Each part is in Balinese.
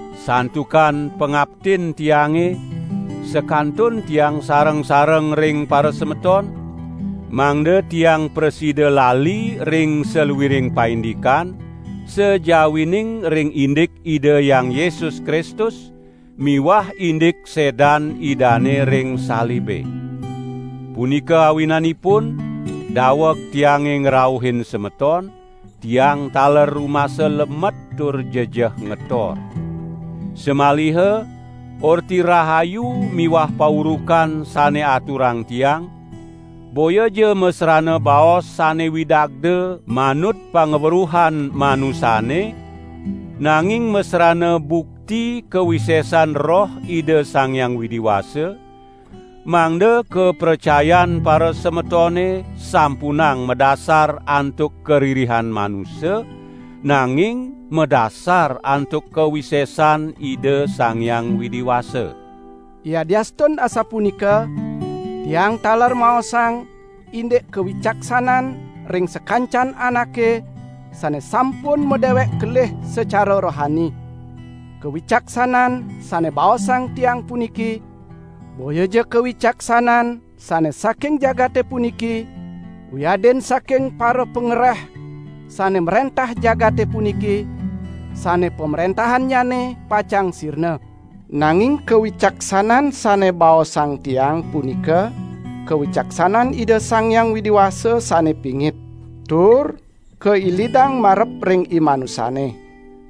Santukan pangaptin tiange sakantun tiang sareng-sareng ring parasemeton, mangda tiang prasida lali ring saluiring paindikan, sajawining ring indik Ida Hyang Yesus Kristus, miwah indik sedan Idane ring salibe. Punika awinanipun daweg tiange ngrauhin semeton, tiang taler rumasa lemet tur jejeh ngetor. Samaliha Orti Rahayu miwah paurukan sane aturang tiang, boyaja masrana baos sane widagda manut pangweruhan manusane, nanging masrana bukti kawisesan Roh Ida Sang Hyang Widi Wasa, mangda kapracayan parasemetone sampunang madasar antuk karirihan manusa, nanging madasar antuk kawisesan Ida Sang Hyang Widi Wasa. Yadiastun asapunika, tiang taler maosang indik kawicaksanan ring sakancan anake sane sampun madewek kelih sacara rohani. Kawicaksanan sane baosang tiang puniki, boyaja kawicaksanan sane saking jagate puniki, wiadin saking parapangereh sane mrentah jagate puniki, sane pamrentahannyane pacang sirna. Nanging kawicaksanan sane baosang tiang punika kawicaksanan Ida Sang Hyang Widi Wasa sane pingit tur kailidang marep ring imanusa.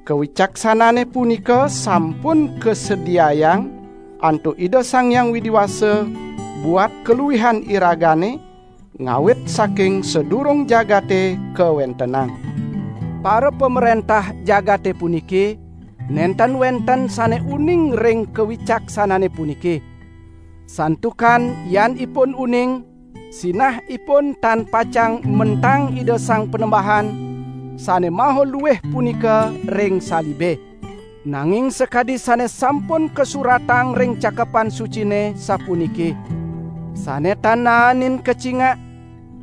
Kawicaksanane punika sampun kasediayang antuk Ida Sang Hyang Widi Wasa buat kaluihan iragane ngawit saking sadurung jagate kawentenang. Parapamrentah jagate puniki nenten wenten sane uning ring kawicaksanane puniki. Santukan yan ipun uning, sinah ipun tan pacang mentang Ida Sang Panembahan sane maha luih punika ring salibe. Nanging sakadi sane sampun kasuratang ring Cakepan Sucine, sapuniki: "Sane tan naenin kacingak,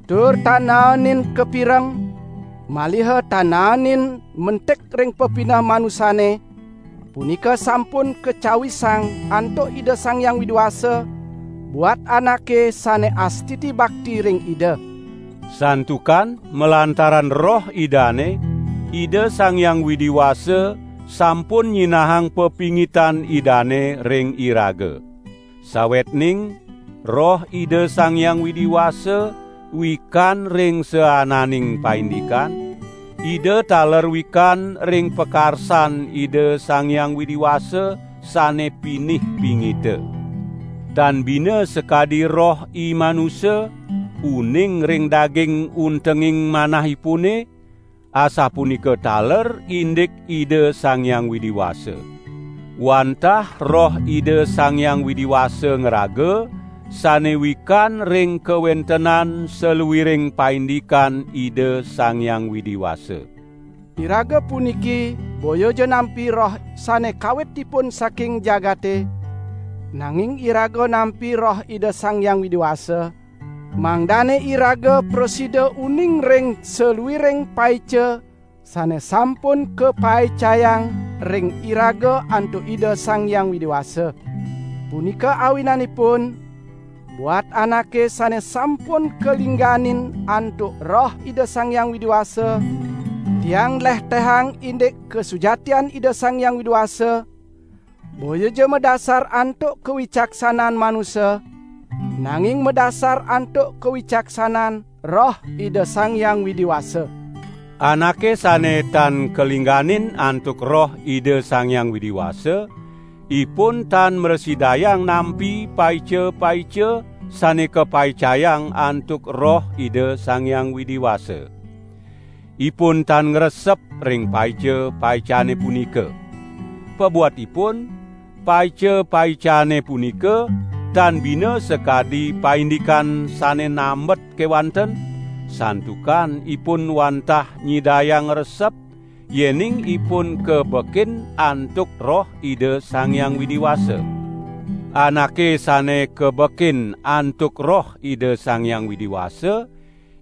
tur tan naenin kapireng, maliha tan naenin mentik ring pepineh manusane, punika sampun kacawisang antuk Ida Sang Hyang Widi Wasa buat anake sane astiti bakti ring Ida." Santukan malantaran Roh Idane, Ida Sang Hyang Widi Wasa sampun nyinahang pepingitan Idane ring iraga. Sawetning Roh Ida Sang Hyang Widi Wasa wikan ring saananing paindikan, Ida taler wikan ring pakarsan Ida Sang Hyang Widi Wasa sane pinih pingita. Tan bina sakadi roh imanusa uning ring daging untenging manahipune, asapunika taler indik Ida Sang Hyang Widi Wasa. Wantah Roh Ida Sang Hyang Widi Wasa ngraga sane wikan ring kawentenan saluiring paindikan Ida Sang Hyang Widi Wasa. Iraga puniki boyaja nampi roh sane kawitipun saking jagate, nanging iraga nampi Roh Ida Sang Hyang Widi Wasa, mangdane iraga prasida uning ring saluiring paica sane sampun kapaicayang ring iraga antuk Ida Sang Hyang Widi Wasa. Punika awinanipun buat anake sane sampun kalingganin antuk Roh Ida Sang Hyang Widi Wasa, tiang nlehtehang indik kasujatian Ida Sang Hyang Widi Wasa, boyaja madasar antuk kawicaksanan manusa, nanging madasar antuk kawicaksanan Roh Ida Sang Hyang Widi Wasa. Anake sane tan kalingganin antuk Roh Ida Sang Hyang Widi Wasa, ipun tan mrasidayang nampi paica-paica sane kapaicayang antuk Roh Ida Sang Hyang Widi Wasa. Ipun tan ngresep ring paica-paicane punika. Pabuat ipun, paica-paicane punika tan bina sakadi paindikan sane nambet kewanten, santukan ipun wantah nyidayang ngresep yening ipun kabekin antuk Roh Ida Sang Hyang Widi Wasa. Anake sane kabekin antuk Roh Ida Sang Hyang Widi Wasa,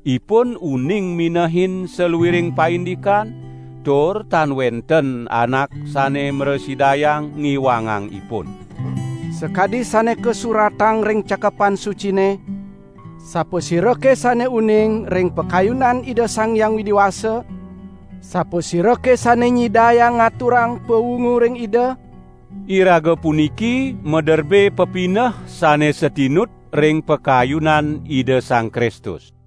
ipun uning minehin saluiring paindikan, tur tan wenten anak sane mrasidayang ngiwangang ipun. Sakadi sane kasuratang ring Cakepan Sucine: "Sapasirake sane uning ring pakayunan Ida Sang Hyang Widi Wasa? Sapasirake sane nyidayang ngaturang pawungu ring Ida?" Iraga puniki maderbe pepineh sane satinut ring pakayunan Ida Sang Kristus.